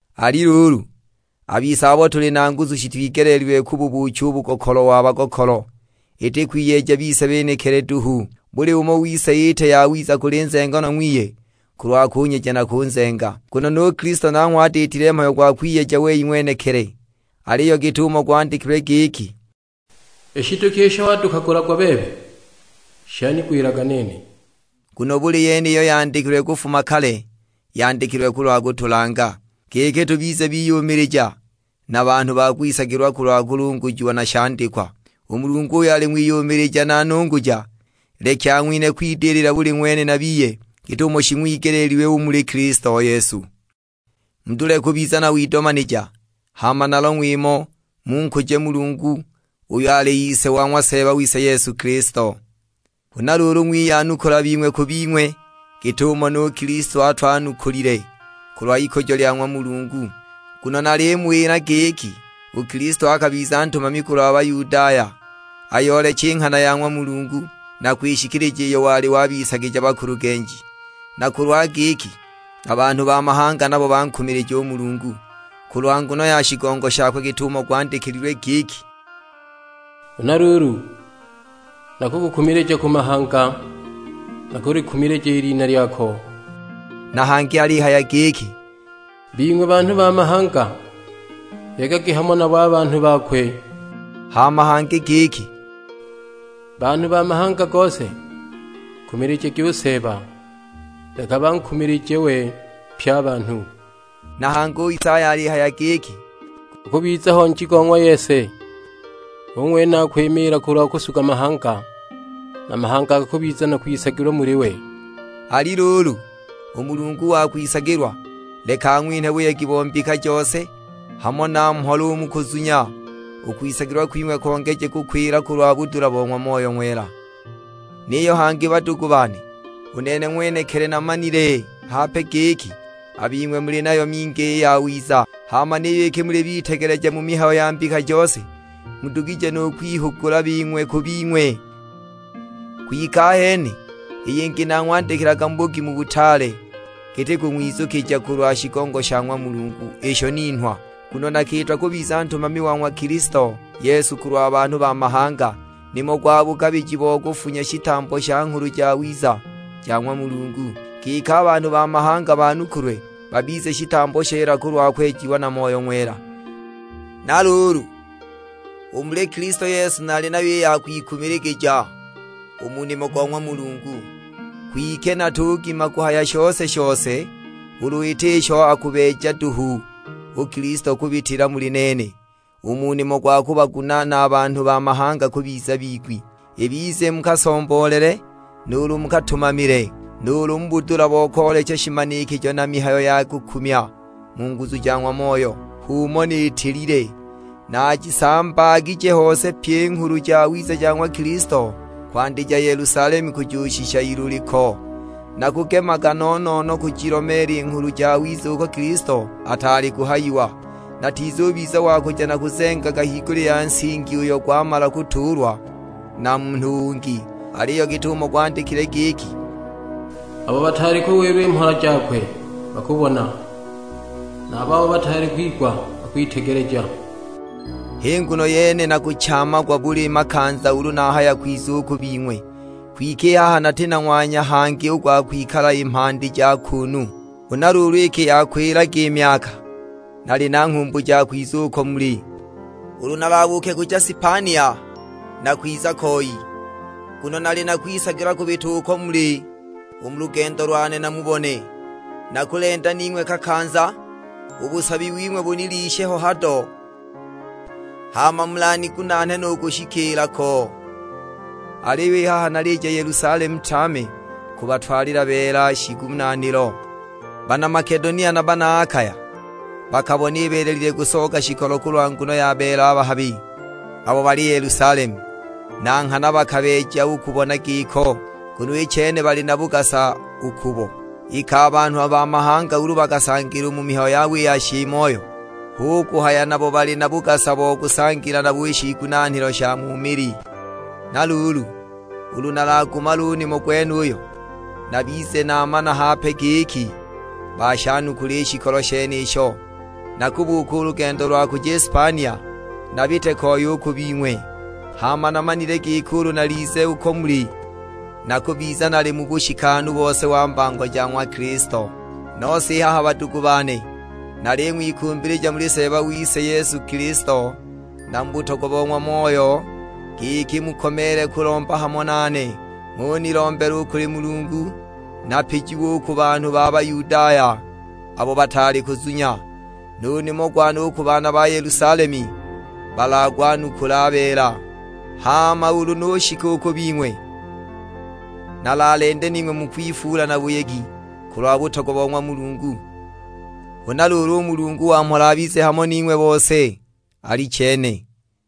Ali luulu, a bise abo tuli na nguzu shitwigeleelilwe kububuucha u bugokolo wa bagokolo, iti kwiyeja bise benekili duhu. Buli umo wise iite yawiza kuli nzenganwa ng'wiye, kulwa kunyeja na kunzenga. Nguno nu Kilisto nanghwe atiitile mhayo gwa kwiyeja wei ng'wenekili, aliyo git'umo gwandikilwe giki, "I shiduki isho wadukagulagwa bebe, shanigwilaga nene." Nguno buli yene iyo yandikilwe kufuma kale, yandikilwe kulwa kutulanga, giki tubize biyumilija, na banhu ba kwisagilwa kulwa kulungujiwa na shandikwa. U Mulungu uyo ali ng'wiyumilija na nunguja, leki ang'winhe kwidilila buli ng'wene na biye git'umo shing'wigeleelilwe u muli Kilisto Yesu. Mudule kubiza na widomanija, hama na long'we imo; munkuje Mulungu uyo ali Ise wa ng'wa Seeba wise Yesu Kilisto. Huna luulu ng'wiyanukula bing'we ku bing'we, git'umo nu Kilisto atwanukulile, kulwa ikujo lya ng'wa Mulungu. Nguno nalimuwila giki, u Kilisto akabiza ntumami kulwa Bayudaya, ayooleche i nghana ya ng'wa Mulungu, na kwishikilija iyo wali wabisagija bakulugenji. Na kulwa giki a banhu ba mahanga nabo bankumilije u Mulungu, kulwa nguno ya shigongo shakwe, git'umo gwandikilwe giki, "Huna luulu, nakukukumilija ku mahanga, na nakulikumilija i lina lyako." Na hangi alihaya giki, "Bing'we banhu ba mahanga, yegagi hamo nabo a banhu bakwe." Hama hangi giki, "Banhu ba mahanga gose, nkumilijagi u Seeba; leka bankumilije we pye a banhu." Na hangi u Isaya alihaya giki, "Gukubiza ho Nji go ng'wa Yese, hu ng'wene akwimiila kulwa kusuga mahanga, a mahanga gakubiza na kwisagilwa muli we." Ali luulu, u Mulungu wa kwisagilwa, leka ang'winhe buyegi bo mbika jose, hamo na mhola u mu kuzunya; u kwisagilwa kwing'we kongeje kukwila kulwa budula bo ng'wa Moyo Ng'wela. Niyo hangi badugu bane, u nene ng'wenekili namanile hape giki, a bing'we muli nayo mingi i yawiza. Hama niyo iki muli bitegeleja mu mihayo ya mbika jose, mudugije nu kwihugula bing'we ku bing'we. Kwike ahene i yingi nang'wandikilaga mu bugimu butaale, giti kung'wizukija kulwa shigongo sha ng'wa Mulungu isho ninhwa. Nguno nakiitwa kubiza ntumami wa ng'wa Kilisto Yesu kulwa banhu ba mahanga; nimo gwa bugabiji bo kufunya shitambo sha Nghulu Jawiza ja ng'wa Mulungu, giki a banhu ba mahanga banukulwe, babize shitambo sheela kulwa kwejiwa na Moyo Ng'wela. Na luulu, u muli Kilisto Yesu nali nayo i ya kwikumiligija u mu nimo go ng'wa Mulungu. Kwike natugima kuhaya shose-shose, ulu iti isho akubeejaga duhu u Kilisto kubitila muli nene, u mu nimo gwa kubagunaana a banhu ba mahanga kubiza bigwi, ibize mu kasomboolele, nuulu mu katumamile; nuulu mu budula bo koolecha shimanikijo na mihayo ya kukumya mu nguzu ja ng'wa Moyo. H'umo niitilile; naajisambaagije hose pyi i Nghulu Jawiza ja ng'wa Kilisto, kwandija Yelusalemu kujushika Iluliko. Nakugemaga no-no-no kujilomeela i Nghulu Jawiza uko Kilisto ataali kuhayiwa, natizubiza wa kuja nakuzengaga higulya ya nsingi uyo gwamala kutuulwa na munhu ungi. Aliyo git'umo gwandikilwe giki, "Abo bataali kuwilwa mhola jakwe bakubona, na a babo bataali kwigwa bakwitegeleja." H'i nguno yene nakuchaamagwa buli makanza ulu nahaya kwiza u ku bing'we. Kwike i haha nati na ng'wanya hangi u gwa kwikala i mhandi ja kuunu. Huna luulu iki yakwilaga i myaka nali na nghumbu ja kwiza uko muli, ulu nalabuuke kuja Spania nakwiza koi; nguno nali na kwisagilwa kubita uko muli u mu lugendo lwane namubone. Nakulenda ning'we kakanza, u busabi wing'we bunilishe ho hado, hama mulanigunaane nu kushikiila ko. Aliyo i haha nalija Yelusalemu tame, kubatwalila beela shiigunaanilo. Bana Makedonia na bana Akaya bakabona ibeelelile kusooga shikolo kulwa nguno ya beela a bahabi, abo bali Yelusalemu. Na nghana bakabeeja u kubona giko, nguno i chene bali na bugasa u kubo, iki a banhu ba mahanga ulu bakasangila u mu mihayo yabo i ya shiimoyo, hu kuhaya nabo bali na bugasa bo kusangila nabo i shiigunaanilo sha mu mili. Na luulu, ulu nalagumale u nimo gwenuyo, nabize naamana hape giki bashanukula i shikolo shenisho, nakubuuka u lugendo lwa kuja i Spania, nabite koi u ku bing'we. Hama namanile giki ulu nalize uko muli, nakubiza nali mu bushikanu bose wa mbango ja ng'wa Kilisto. Nose i haha badugu bane, naling'wikumbilija muli Seeba wise Yesu Kilisto, na mu butogwa bo ng'wa Moyo, giki mukomeele kulomba hamo nane, ng'unilombela u kuli Mulungu. Napijiwe u ku banhu ba Buyudaya abo bataali kuzunya, nu nimo gwane u ku bana Yelusalemu balagwanukule a beela. Hama ulu nushika u ku bing'we, nalalende ning'we mu kwifuula na buyegi kulwa butogwa bo ng'wa Mulungu. Huna luulu u Mulungu wa mhola abize hamo ning'we bose. Alichene!